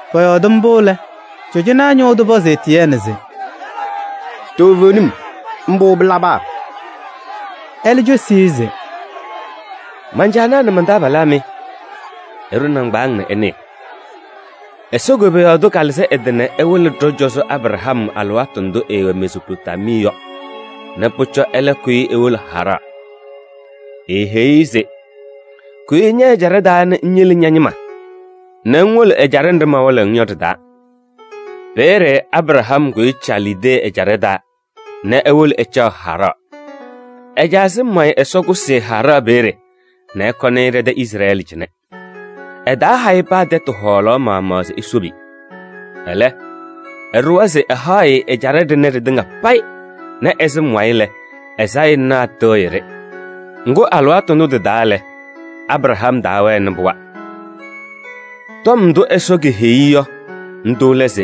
Pɔyɔɔdɩ mbʋ lɛ, cɔjɔnaa ñʋʋ tʋ pɔzɩ Etiyɛɛnɩ se: “Toovenim mbʋ pɩlaba?” Ɛlɛ cosi-i se: “Man-caanaa nɛ man-taabalaa mɩ! Ɩɖʋ nɩŋgbaaŋ nɛ ɩnɩɩ. Ɛsɔ koboyaɣ tʋ kalɩzɩ ɛ-tɩ nɛ ɛwɩlɩ ɖɔ-cɔzɔ Abraham alɩwaatʋ ndʋ ɛɛwɛ Mezoopotamii yɔ nɛ pʋcɔ ɛlɛ kʋyɩ ewolo Haraɣ. Eeheyi-i se: ‘Kʋyɩ ñɛ-ɛjaɖɛ taa nɛ ŋyele ña-ñɩma nɛ ŋwolo ɛjaɖɛ nɖɩ mawɩlɩɣ-ŋ yɔ ɖɩ-taa.’ Peeye Abraham kʋyɩ Calidee ɛjaɖɛ taa nɛ ewolo ɛcaɣ Haraɣ. Ɛ-caa sɩm wayɩ Ɛsɔ kʋsɩ-ɩ Haraɣ peeye nɛ ɛkɔnɩ-ɩ ɖɛ-tɛ Izrɛɛlɩ cɩnɛ. Ɛtaaha-ɩ paa tɛtʋ hɔɔlaɣ maɣmaɣ se esobi. Ɛlɛ, ɛɖʋwa se ɛhaɣ-ɩ ɛjaɖɛ ɖɩnɛ ɖɩtɩŋa payɩ nɛ ɛ-sɩm wayɩ lɛ, ɛ-sayɩnaa tɩɣyɩ-ɖɩ. Ŋgʋ, alɩwaatʋ ndʋ tɩ-taa lɛ, Abraham taawɛnɩ pɩɣa. Tɔm ndʋ Ɛsɔ keheyi-i yɔ, ndʋ lɛ se: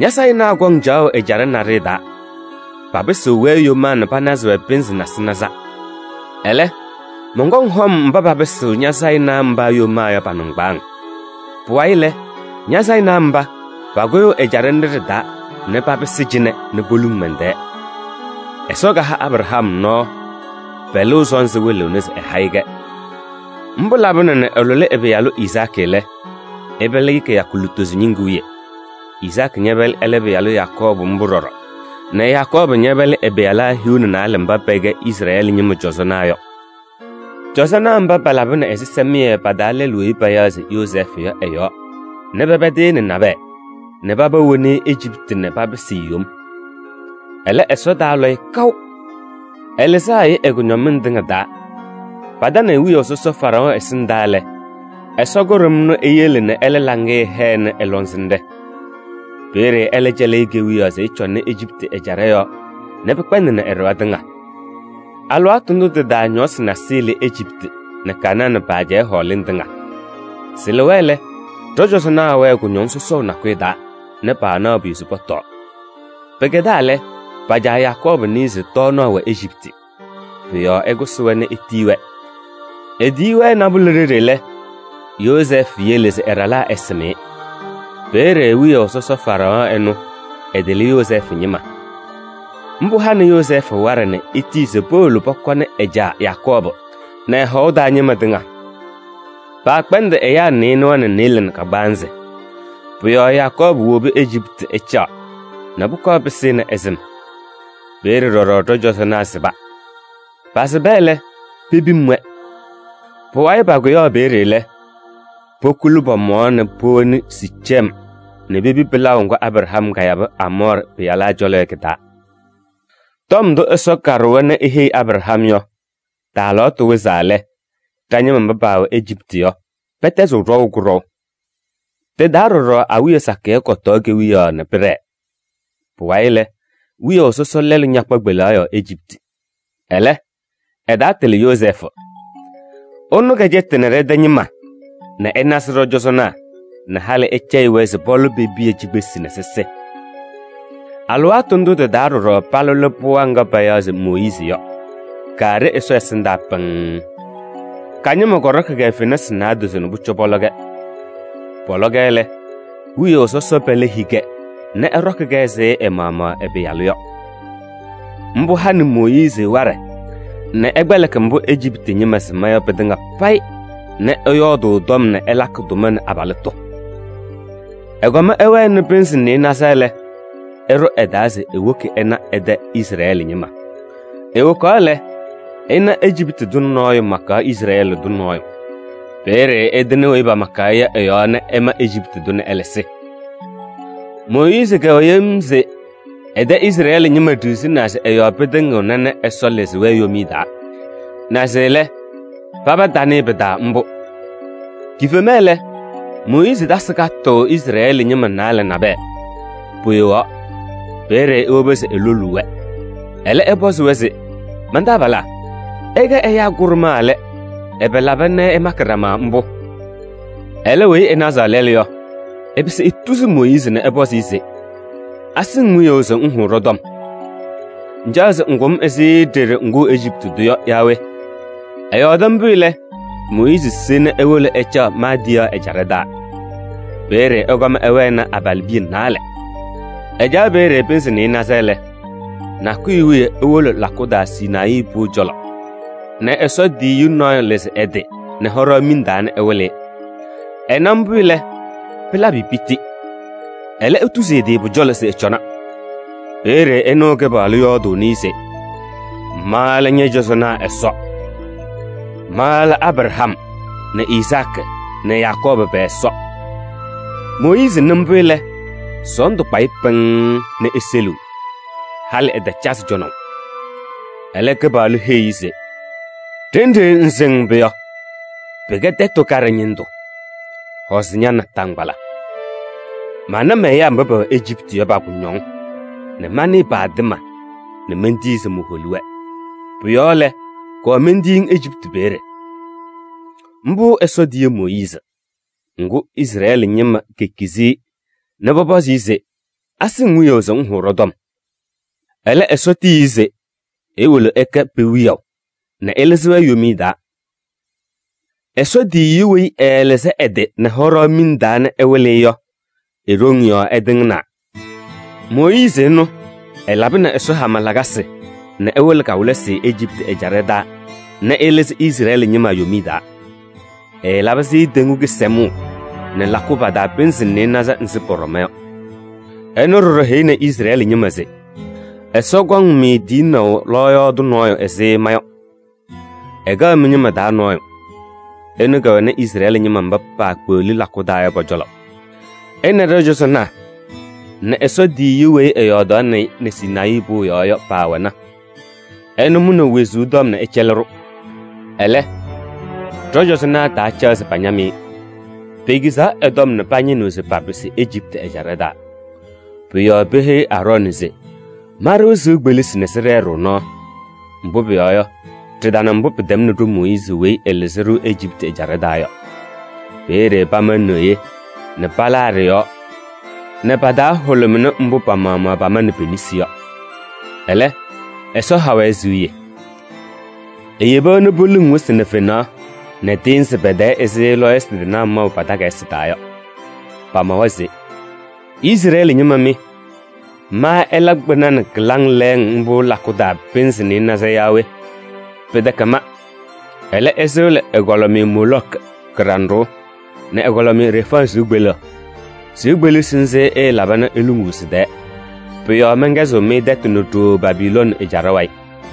‘Ña-sayɩnaa kɔŋ caɣʋ ɛjaɖɛ naɖɩyɛ taa, papɩsɩɣ-wɛ yomaa nɛ panazɩ-wɛ pɩnzɩ nasɩnaza. Ɛlɛ, mɔnkɔŋ hɔm mba papɩsɩɣ ña-sayɩnaa mba yomaa yɔ pa-nɩŋgbaaŋ. Pʋwayɩ lɛ, ña-sayɩnaa mba, pakʋyʋʋ ɛjaɖɛ nɖɩ ɖɩ-taa nɛ papɩsɩ cɩnɛ nɛ poluŋ mɛn-tɛɛ.’ Ɛsɔ kaha Abraham nɔɔ, pɛlʋʋ sɔnzɩ wɩlɩɣnɩ se ɛha-ɩ-kɛ. Mbʋ labɩna nɛ ɛlʋlɩ ɛ-pɩyalʋ Izaakɩ lɛ, ɛpɛlɩ-ɩ kɩyakʋ lutozo ñɩŋgʋ wiye, Izaakɩ ñɛpɛlɩ ɛlɛ pɩyalʋ Yakɔɔbʋ mbʋ ɖɔɖɔ nɛ Yakɔɔbʋ ñɛpɛlɩ ɛ-pɩyalaa hiu nɛ naalɛ mba pɛkɛ Izrɛɛlɩ ñɩma cɔzɔnaa yɔ. Cɔzɔnaa mba palabɩnɩ ɛzɩsɛmɩyɛ pa-taa lɛlʋ weyi payaɣ se Yozɛɛfʋ yɔ ɛ-yɔɔ nɛ pɛpɛdɩ-ɩ nɛ nabɛyɛ nɛ paba woni-i Ejiptɩ nɛ papɩsɩ-ɩ yom. Ɛlɛ, Ɛsɔ taalɔ-ɩ kaʋ. Ɛlɩzaɣ-ɩ ɛ-kʋñɔmɩŋ tɩŋa taa. Patanɩ-ɩ wiyaʋ sɔsɔ Faraɔɔ ɛsɩndaa lɛ, Ɛsɔ kʋɖʋm ɛnʋ eyele nɛ ɛlɛ laŋɩyɛ hɛnɩ ɛ-lɔŋsɩnɖɛ. Peeye ɛlɛ cɛlɩ-ɩ kewiyaɣ se ɛcɔnɩ Ejiptɩ ɛjaɖɛ yɔɔ nɛ pɩkpɛndɩnɩ ɛ-ɖɩɣa tɩŋa. Alɩwaatʋ ndʋ tɩ-taa ñɔɔsɩ nasɩyɩ lɩ Ejiptɩ nɛ Kanaanɩ pa-ajɛɛ hɔɔlɩŋ tɩŋa. Sɩlɩwa lɛ, ɖɔ-cɔzɔnaa wɛɛ kʋñɔŋ sɔsɔʋ nakʋyʋ taa nɛ paanaɣ pʋyʋ se pɔtɔɔ. Pɩkɛdaa lɛ, pa-caa Yakɔɔbʋ nɩɩ se tɔɔnaɣ wɛ Ejiptɩ. Pʋ-yɔɔ ɛkʋsɩ-wɛ nɛ etiyi-wɛ. Etiyi-wɛ nabʋlɛ ɖeɖe lɛ, Yozɛɛfʋ yele se ɛ-ɖalaa ɛsɩm-ɩ. Peeye wiyaʋ sɔsɔ Faraɔɔ ɛnʋ, ɛtɩlɩ Yozɛɛfʋ ñɩma. Mbʋ hanɩ Yozɛɛfʋ waɖɛ nɛ etiyi se powolo pɔkɔnɩ ɛ-caa Yakɔɔbʋ nɛ ɛ-hɔʋ taa ñɩma tɩŋa. Paakpɛndɩ ɛyaa nɩɩnʋwa nɛ nɩɩlɛ nɛ kagbaanzɩ. Pʋ-yɔɔ Yakɔɔbʋ wobi Ejiptɩ ɛcaɣ nɛ pʋkɔɔ pɩsɩnɩ ɛ-sɩm. Peeye ɖɔɖɔ ɖɔ-cɔzɔnaa sɩba. Pasɩba lɛ, pepim-wɛ. Pʋwayɩ pakʋyaɣ peeye lɛ, pokuli pɔ-mɔɔ nɛ powoni Siicem nɛ pepi pɩlaʋ ŋgʋ Abraham kayabɩ Aamɔɔrɩ pɩyalaa cɔlɔ yɔ kɩ-taa. Tɔm ndʋ Ɛsɔ kaɖʋwa nɛ eheyi Abraham yɔ, tɩ-alɩwaatʋ wɩzaa lɛ, ɖa-ñɩma mba paawɛ Ejiptɩ yɔ, pɛtɛzɩɣ ɖɔʋ kʋɖɔʋ. Tɩ-taa ɖɔɖɔ awiya sakɩyɛ kɔtɔɔ kewiyaɣ nɛ pɩɖɛɛ. Pʋwayɩ lɛ, wiyaʋ sɔsɔ lɛɛlʋ ñakpa kpelaɣ yɔɔ Ejiptɩ. Ɛlɛ, ɛtaatɩlɩ Yozɛɛfʋ. Ɛnʋ kɛcɛtɩnɩ ɖɛ-tɛ ñɩma nɛ ɛnazɩ ɖɔ-cɔzɔnaa nɛ halɩ ɛcɛyɩ-wɛ se pɔlɔ pe-piya cikpesi nɛ sɩsɩ. Alɩwaatʋ ndʋ tɩ-taa ɖɔɖɔ palʋlɩ pɩɣa ŋga payaɣ se Mooyiizi yɔ, kaaɖe Ɛsɔ ɛsɩndaa pɩŋŋ. Ka-ñɩma kɔɖɔkɩ-kɛ fenasɩ naadozo nɛ pʋcɔ pɔlɔ-kɛ. Pɔlɔ-kɛ lɛ, wiyaʋ sɔsɔ pɛlɛ hii-kɛ nɛ ɛɖɔkɩ-kɛ ɛzɩ ɛ-maɣmaɣ ɛ-pɩyalʋ yɔ. Mbʋ hanɩ Mooyiizi waɖɛ nɛ ɛkpɛlɩkɩ mbʋ Ejiptɩ ñɩma sɩma yɔ pɩtɩŋa payɩ nɛ ɛyɔɔdʋʋ tɔm nɛ ɛlakɩ tʋma nɛ abalɩtʋ. Ɛkɔm ɛwɛnɩ pɩnzɩ nɩɩnaza lɛ, ɛɖʋ ɛ-taa se ewoki ɛna ɛ-tɛ Izrɛɛlɩ ñɩma. Ewokaɣ lɛ, ɛna Ejiptɩ tʋ nɔɔyʋ makaɣ Izrɛɛlɩ tʋ nɔɔyʋ. Peeye ɛtɩnɩ weyi pamakaɣ-ɩ yɔ ɛ-yɔɔ nɛ ɛma Ejiptɩ tʋ nɛ ɛlɛ sɩ. Mooyiizi kɛwɛ yem se ɛ-tɛ Izrɛɛlɩ ñɩma ɖiɣzinaa se ɛ-yɔɔ pɩtɩŋɩɣna nɛ Ɛsɔ lɩzɩ-wɛ yomiye taa. Naze lɛ, paba tanɩɩ pɩ-taa mbʋ. Kifema lɛ, Mooyiizi tasɩ katʋʋ Izrɛɛlɩ ñɩma naalɛ nabɛyɛ, poyowaɣ. Peeye ewobi se eloluu-wɛ, ɛlɛ ɛpɔzɩ-wɛ se: ‘Man-taabalaa! Ɩkɛ ɛyaa kʋɖʋmaa lɛ, ɛbɛ laba nɛ ɩmakɩ ɖama mbʋ?’ Ɛlɛ weyi ɛnazaɣ lɛlʋ yɔ, ɛpɩsɩ etuzi Mooyiizi nɛ ɛpɔzɩ-ɩ se: ‘Asɩ-ŋ wiyaʋ se ŋhʋʋ ɖɔ-tɔm? Ŋcaɣ se ŋkʋ-m ɛzɩ ɖeɖe ŋkʋʋ Ejiptɩ tʋ yɔ yaa we?’ Ɛyɔɔdɩ mbʋ lɛ, Mooyiizi se nɛ ewolo ɛcaɣ Maadiyaɣ ɛjaɖɛ taa. Peeye ɛkɔm ɛwɛnɩ abalɩbiya naalɛ. Ɛcaɣ peeye pɩnzɩ nɩɩnaza lɛ, nakʋyʋ wiye ewolo lakʋ taa Sinayii pʋʋ cɔlɔ nɛ Ɛsɔ tiyiyu nɔɔyʋ lɩzɩ ɛ-tɩ nɛ hɔɖaɣ miŋ taa nɛ ɛwɩlɩ-ɩ. Ɛna mbʋ lɛ, pɩlabɩ-ɩ piti. Ɛlɛ etuzi ɛ-tɩ pʋ-cɔlɔ se ɛcɔna. Peeye ɛnɩɣ Kɩpaɣlʋ yɔɔdʋʋnɩ-ɩ se: ‘Ma lɛ ñɔ-cɔzɔnaa Ɛsɔ. Ma lɛ Abraham nɛ Izaakɩ nɛ Yakɔɔbʋ pɛ-Ɛsɔ.’ Mooyiizi nɩ mbʋ lɛ, sɔɔndʋ kpa-ɩ pɩŋŋ nɛ eseliɣ, halɩ ɛtacazɩ cɔnaʋ. Ɛlɛ Kɩpaɣlʋ heyi-i se: ‘Ɖenɖe ŋsɩŋ mbʋ yɔ, pɩkɛ tɛtʋ kaɖɛ ñɩndʋ. Hɔzɩ ña-naataŋgbala. Mana mɛ-ɛyaa mba pɛwɛ Ejiptɩ yɔ pa-kʋñɔŋ nɛ manɩɩ pa-atɩma nɛ mentii se moholi-wɛ. Pʋ-yɔɔ lɛ, kɔɔ mentiyi-ŋ Ejiptɩ peeye.’ Mbʋ Ɛsɔ tiyi Mooyiizi. Ŋgʋ, Izrɛɛlɩ ñɩma kekizi-i nɛ pɔpɔzɩ-ɩ se: ‘Asɩ-ŋ wiyaʋ se ŋhʋʋ ɖɔ-tɔm?’ Ɛlɛ, Ɛsɔ tiyi-i se ewolo ɛkɛ pe-wiyaʋ nɛ ɛlɩzɩ-wɛ yomiye taa. Ɛsɔ tiyiyu weyi ɛɛlɩzɩ ɛ-tɩ nɛ hɔɖaɣ miŋ taa nɛ ɛwɩlɩ-ɩ yɔ, e-ɖoŋ yɔɔ ɛtɩŋnaa. Mooyiizi ɛnʋ ɛlabɩnɩ Ɛsɔ hama lakasɩ nɛ ɛwɩlɩ kawɩlɩsɩ Ejiptɩ ɛjaɖɛ taa nɛ ɛlɩzɩ Izrɛɛlɩ ñɩma yomiye taa. Ɛɛlabɩ-sɩ Teŋgu Kɩsɛmʋʋ nɛ lakʋ pa-taa pɩnzɩ nɩɩnaza nzɩ pɔɖɔma yɔ. Ɛnʋ ɖɔɖɔ heyini Izrɛɛlɩ ñɩma se: ‘Ɛsɔ kɔŋ-mɩ tiyinaʋ lɔɔyaɣ tʋ nɔɔyʋ ɛzɩ ma yɔ, ɛkɛɣ mɩ-ñɩma taa nɔɔyʋ.’ Ɛnʋ kɛwɛnɩ Izrɛɛlɩ ñɩma mba paakpeɣli lakʋ taa yɔ pɔ-cɔlɔ: ɛ nɛ ɖɔ-cɔzɔnaa nɛ Ɛsɔ tiyiyu weyi ɛyɔɔdaɣnɩ-ɩ nɛ Sinayii pʋʋ yɔɔ yɔ paawɛna. Ɛnʋ mʋnɩ wezuu tɔm nɛ ɛcɛlɩ-ɖʋ. Ɛlɛ, ɖɔ-cɔzɔnaa taacaɣ se pañam-ɩ. Pekizaɣ ɛ-tɔm nɛ pañɩnɩɣ se papɩsɩ Ejiptɩ ɛjaɖɛ taa. Pʋ-yɔɔ peheyi Aarɔɔnɩ se: ‘Ma-ɖʋ sɩʋ kpelisi nɛ sɩɖɛɛ-ɖʋ nɔɔ. Mbʋ pʋyɔɔ yɔ, ɖɩtana mbʋ pɩtɛmnɩ ɖo-Mooyiizi weyi ɛlɩzɩ-ɖʋ Ejiptɩ ɛjaɖɛ taa yɔ.’ Peeye pama neɣye nɛ palaa ɖɩ-yɔɔ nɛ pa-taa hʋlʋmɩnɩ mbʋ pa-maɣmaɣ pamanɩ pe-nesi yɔ. Ɛlɛ, Ɛsɔ ha-wɛ siɣye. Eyebi-wɛ nɛ poluŋ wɩsɩ nɛ fenaɣ nɛ tɩɩnzɩ pɛ-tɛɛ ɛzɩ lɔɔyɩsɩ tɩnaa maʋ pa-takayɩsɩ taa yɔ. Pamawa se: ‘Izrɛɛlɩ ñɩma mɩ! Ma ɩla kpɩna nɛ kɩlaŋ lɛɛŋ mbʋ lakʋ taa pɩnzɩ nɩɩnaza yaa we? Pɩtɛkɛ ma. Ɛlɛ, ɩsɩɣlɩ ɛgɔlɩmɩyɛ Moolɔkɩ kɩɖanɖʋʋ nɛ ɛgɔlɩmɩyɛ Refaɣ sɩʋ kpeleɣ. Sɩʋ kpelisi nzɩ ɩɩlaba nɛ iluŋuu sɩ-tɛɛ! Pʋ-yɔɔ mɛnkɛzɩɣ-mɩ tɛtʋ nɛ ɖooo Babilooni ɛjaɖɛ wayɩ!’”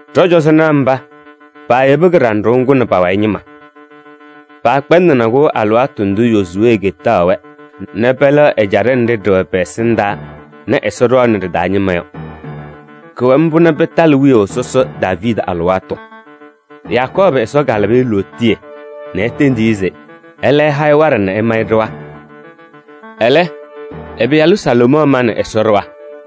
Ɖɔ-cɔzɔnaa mba, paayebi kɩɖanɖʋʋ ŋgʋ nɛ pa-wayɩ ñɩma. Paakpɛndɩnɩ-kʋ alɩwaatʋ ndʋ Yozuwee ketaɣ-wɛ nɛ pɛlɛɣ ɛjaɖɛ nɖɩ ɖɩwɛ pɛ-ɛsɩndaa nɛ Ɛsɔ ɖɔɔnɩ ɖɩ-taa ñɩma yɔ. Kʋwɛ mbʋ nɛ pɩtalɩ wiyaʋ sɔsɔ Daaviidi alɩwaatʋ. Yakɔɔbʋ Ɛsɔ kalabɩ-ɩ lootiye nɛ etendi-i se ɛlɛ ɛha-ɩ waɖɛ nɛ ɛma-ɩ ɖɩɣa. Ɛlɛ, ɛ-pɩyalʋ Salomɔɔ manɩ Ɛsɔ ɖɩɣa.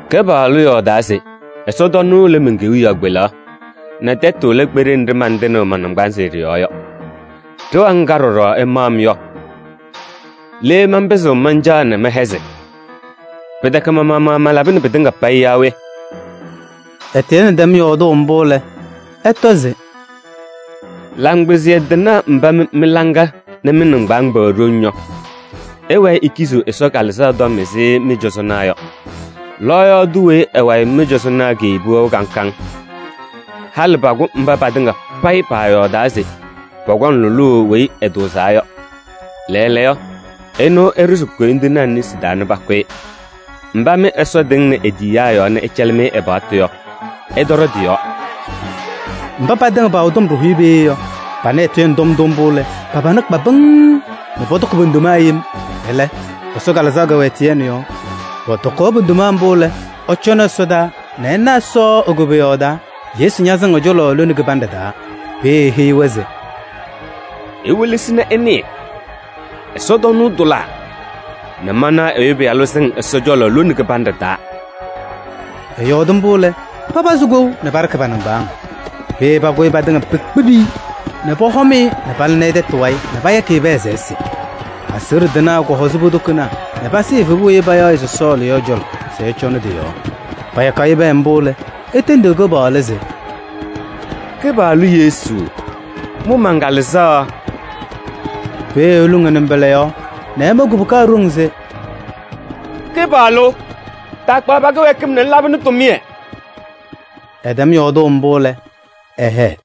‘Kɩpaɣlʋ yɔɔdaa se ɛsɔtɔnʋʋ lɛ men-kewiyaɣ kpelaɣ nɛ tɛtʋ lɛ kpeɖe nɖɩ mantɩnɩɣ ma-naŋgbanzɩ ɖɩ-yɔɔ yɔ. Ɖɩɣa ŋga ɖɔɖɔ ɩmaɣ-m yɔ? Le manpɩzɩɣ mancaɣ nɛ mɛhɛzɩ? Pɩtɛkɛ ma-maɣmaɣ malabɩnɩ pɩtɩŋa payɩ yaa we?’” Etiyɛɛnɩ tɛm yɔɔdʋʋ mbʋ lɛ, ɛtɔ se: “Laŋkpɩzɩyɛ tɩnaa mba mɩ mɩ-laŋa nɛ mɩ-nɩŋgbaaŋ pɛwɛ ɖoŋ yɔ! Ɩwɛɛ ikiziɣ Ɛsɔ Kalɩzaɣ tɔm ɛzɩ mɩ-cɔzɔnaa yɔ! Lɔɔyaɣ tʋ weyi ɛ-wayɩ mɩ-cɔzɔnaa keyebi wɛʋ kaŋ kaŋ? Halɩ pakʋ mba patɩŋa payɩ paayɔɔdaa se pɔkɔŋ lʋlʋʋ Weyi Ɛtʋʋzaa yɔ. Lɛɛlɛɛyɔ, ɛnʋ ɩɖʋzɩ koyindinaa nesi taa nɛ pakʋ-ɩ. Mba mɩ Ɛsɔ tɩŋnɩ e-tiyiyaa yɔɔ nɛ ɛcɛlɩ-mɩ ɛ-paɣtʋ yɔ, ɩtɔɖɔ tɩ-yɔɔ!” Mba patɩŋa paawɛ tɔm ɖɩhʋyɛ peeye yɔ, panɩ Etiyɛɛnɩ tɔm ndʋ mbʋ lɛ, pa-pana kpa pɩŋŋ nɛ pɔtɔkɩ po-ndoma yem. Ɛlɛ, Ɛsɔ Kalɩzaɣ kɛwɛ Etiyɛɛnɩ yɔɔ. Pɔtɔkaɣ po-ndoma mbʋ lɛ, ɛcɔnɩ ɛsɔdaa nɛ ɛna Ɛsɔ e-koboyaɣ taa, Yesu ñasɩŋ ɛ-cɔlɔ lone kɩbanɖɛ taa. Peeye eheyi-wɛ se: “Iwelesi nɛ ɩnɩɩ: ɛsɔtɔnʋʋ tʋlaa nɛ manaɣ Ɛyʋ Pɩyalʋ sɩŋ Ɛsɔ cɔlɔ lone kɩbanɖɛ taa.” Ɛyɔɔdɩ mbʋ lɛ, papazɩ kou nɛ paɖɩɣ pa-nɩŋgbaaŋ! Peeye pakʋyɩ patɩŋa pekpibi-i nɛ pɔhɔm-ɩ nɛ palɩnɩ tɛtʋ wayɩ nɛ payakɩ-ɩ pɛɛ se ɛsɩ. Aseɣɖe tɩnaa kɔhɔzɩ po-tokonaa nɛ pasɩɩ evebu weyi payaɣ se Sɔɔlɩ yɔ ɛ-cɔlɔ se ɛcɔnɩ tɩ-yɔɔ. Payakaɣ-ɩ pɛɛ mbʋ lɛ, etendi Kɩpaɣlʋ se: “Kɩpaɣlʋ Yesu! Mʋ man-kalɩzaɣ!” Peeye eluŋ ɛ-nɩmbɔla yɔɔ nɛ ɛma kubuka ɖoŋ se: “Kɩpaɣlʋ! Taakpaɣ pa-kɩwɛɛkɩm nɛ ŋlabɩnɩ tʋmɩyɛ!” Ɛtɛm yɔɔdʋʋ mbʋ lɛ, ɛhɛɛ.